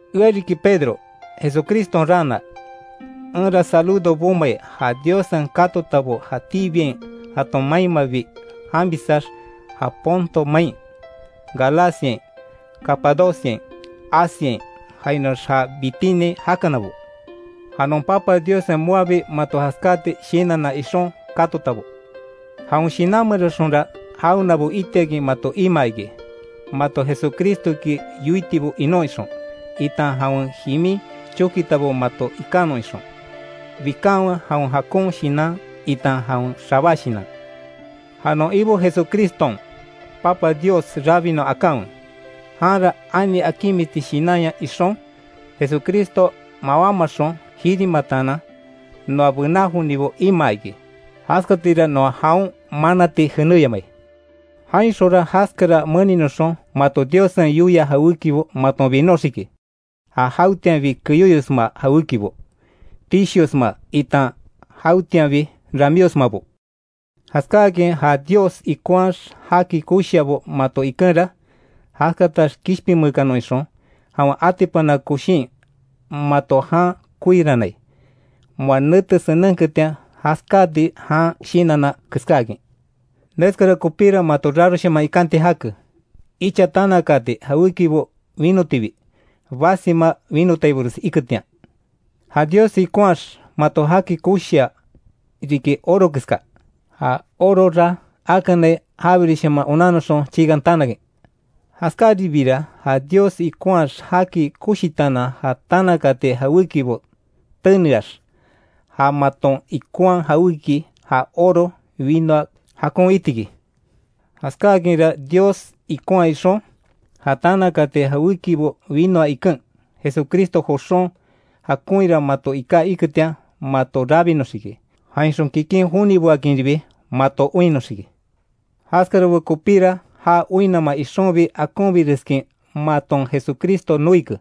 Ea riki Pedro, Jesucriston raana, enra saludo bomai ja Diossen katotabo jatíbiain jaton mainmabi janbisax, ja Ponto main, Galaciain, Capadociain, Asiain, jainoax ja Bitiniain jakanabo. Ja non Papa Diossen moabi mato jaskáati shinanna ixon katotabo. Jawen Shinan meranxonra jawenabo itiakin mato imaa iki; mato Jesucristoki yoitibo inon ixon, itan jawen jimin chokitabo maton ikanon ixon. Bikanwe jawen jakon shinan itan jawen xabá shinan. Ja non Ibo Jesucriston Papa Dios rabinon akanwe, janra ani akinmisti shinanya ixon, Jesucristo mawámaxon jirimataanan noa bená jonibo imaa iki, jaskatira noa jaon manati jenéyamai. Jainxonra jaskara meninoxon mato Diossen yoia jawékibo maton binoxiki, ja jawetianbi keyóyosma jawékibo, tishiosma, itan jawetianbi ramíosmabo. Jaskáakin ja Dios ikonhaax jaki koshiabo mato ikenra, jaskatax kishpinmeekanon ixon, jawen atipana koshin mato jan koirannai; moa nete senenketian jaskáati jan shinanna keskáakin. Neskara kopíra mato raroshaman ikanti jake; icha tanakaati jawékibo winotibi, basima winotaibores iketian. Ja Dios ikonhaax mato jaki koshia riki oro keska; ja orora akanai jabiresshaman onannoxon chiikan tanakin. Jaskáribiira ja Dios ikonhaax jaki koshitaanan ja tanakaati jawékibo teneax, ja maton ikonhaa jawéki ja oro winoa jakon itiki. Jaskáakinra Dios ikonhaa ixon, ja tanakaati jawékibo winoa iken, Jesucristo joxon jakoinra mato iká iketian mato rabinoxiki, jainxon kikin joniboakinribi mato oinnoxiki. Jaskarabo kopíra já oinnama ixonbi akonbireskin maton Jesucristo noike,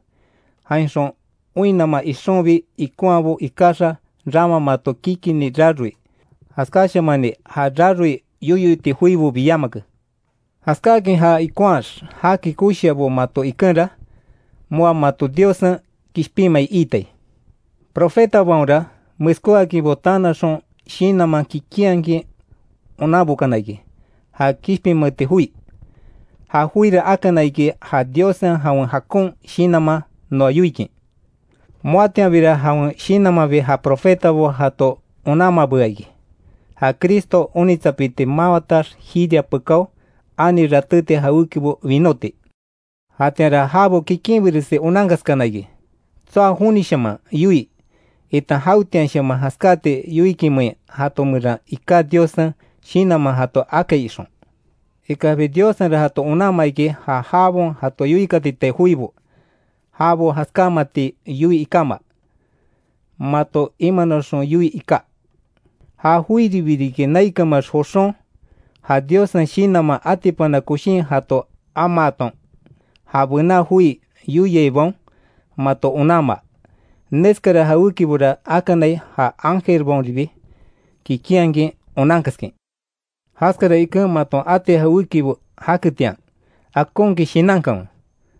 jainxon oinnama ixonbi ikonhaabo ikaxa rama mato kikini raroi, jaskáshamani ja raroi yoyo iti joibobi yamake. Jaskáakin ja ikonhaax jaki koshiabo mato ikenra, moa mato Diossen kishpinmai iitai. Profetabaonra meskóakinbo tanaxon shinanman kikinhakin onanbokana iki ja kishpinmeeti joi, ja joira akana iki ja Diossen jawen jakon shinanman noa yoikin. Moatianbira jawen Shinanmanbi ja profetabo jato onanmabea iki, ja Cristo onitsapiti mawatax jiria pekáo, ani ratéti jawékibo winóti; jatianra jabo kikinbiresi onankaskana iki, tsoa jonishaman yoii itan jawetianshaman jaskati yoikinmein jato meran iká Diossen Shinanman jato akai ixon. Ikaxbi Diossenra jato onanmaa iki, ja jabaon jato yoikatitai joibo, jabo jaskámati yoii ikáma, mato imanoxon yoii iká. Ja joiribi riki naikanmeax joxon, ja Diossen Shinanman atipana koshin jato amaaton, ja bena joi yoiaibaon mato onanmaa. Neskara jawékibora akanai ja ángelbaonribi kikinhakin onankaskin. Jaskara iken maton ati jawékibo jaketian, akonkin shinankanwe.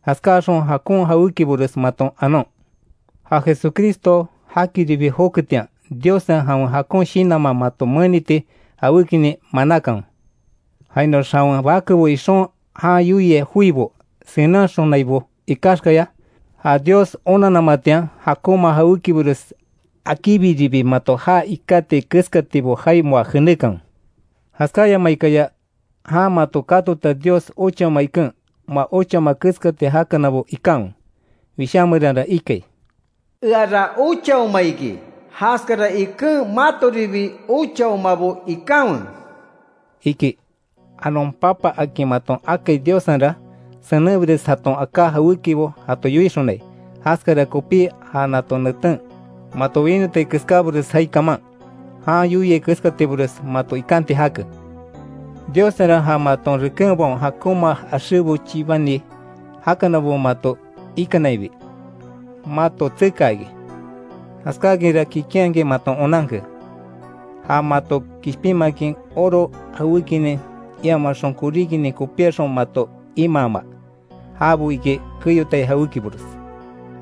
Jaskáaxon jakon jawékibores maton anon. Ja Jesucristo jakiribi joketian, Diossen jawen jakon shinanman mato meniti jawékinin manákanwe. Jainoax jawen bakebo ixon jan yoiai joibo senenhaxonaibo ikaxkaya, ja Dios onanamatian jakonma jawékibores akíbiribi mato jaa ikátiai keskatibo jaai moa jenékanwe. Jaskáyamaikaya jan mato katota Dios ochaoma iken, moa ochaoma keskati jakanabo ikanwe. Wishá meranra ikai: “Eara ochaoma iki, jaskara iken matoribi ochaomabo ikanwe”, iki. Ja non Papa akin maton akai Diossenra, senenbires jaton aká jawékibo jato yoixonai, jaskara kopí ja nato neten mato winotai keskábores jaai kaman, jan yoiai keskatibores mato ikanti jake. Diossenra ja maton rekenbaon jakonma axébo chibani jakanabo mato ikanainbi, mato tsekaa iki; jaskákinra kikinhakin maton onanke ja mato kishpinmakin oro jawékinin, iamaxon koríkinin kopíaxon mato imaama, jabo iki keyotai jawékibores.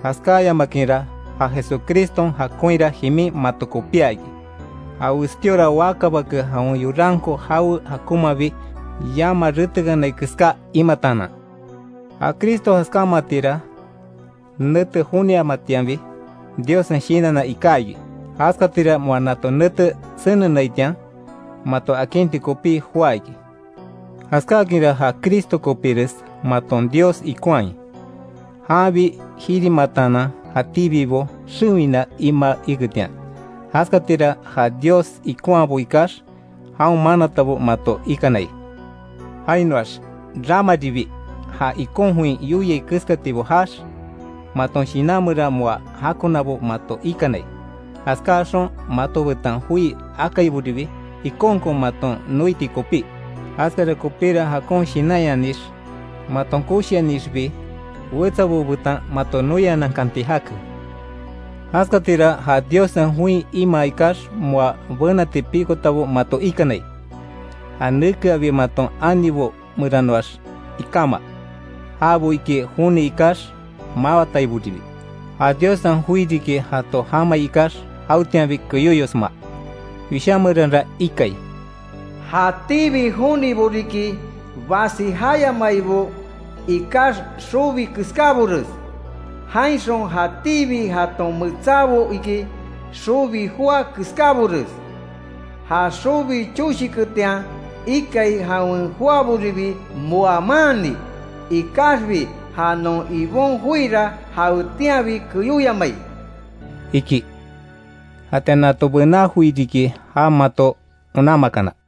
Jaskáyamakinra ja Jesucriston jakonhira jimin mato kopía iki; ja westíora waka bake jawen yoranko jawe jakonmabi yama retekanai keská imataanan. Ja Cristo jaskámatira nete joniamatianbi Diossen shinanna iká iki; jaskatira moa nato nete senenaitian, mato akinti kopí joá iki. Jaskáakinra ja Cristo kopíres maton Dios ikonhai, janbi jirimataanan jatíbibo xewina imaa iketian; jaskatira ja Dios ikonhaabo ikax, jaon manatabo mato ikanai. Jainoax ramaribi ja ikon join yoiai keskatibo jaax, maton shinan meran moa jakonabo mato ikanai, jaskáaxon mato betan joi akaiboribi ikonkon maton noiti kopí, jaskara kopíra jakon shinanyanix, maton koshianixbi wetsabo betan mato noianankanti jake. Jaskatira ja Diossen join imaa ikax, moa benati pikotabo mato ikanai, ja nekeabi maton anibo meranoax ikama, jabo iki joni ikax mawataiboribi, ja Diossen joi riki jato jamai ikax jawetianbi keyoyosma. Wishá meranra ikai: “jatíbi jonibo riki basi jayamaibo ikax xobi keskábores, jainxon jatíbi jaton metsábo iki, xobi joa keskábores, ja xobi choshiketian ikai, jawen joaboribi moa maanni, Ikaxbi ja non Ibon joira jawetianbi keyóyamai”, iki. Jatian ja nato bená joi riki, ja mato onanmakana.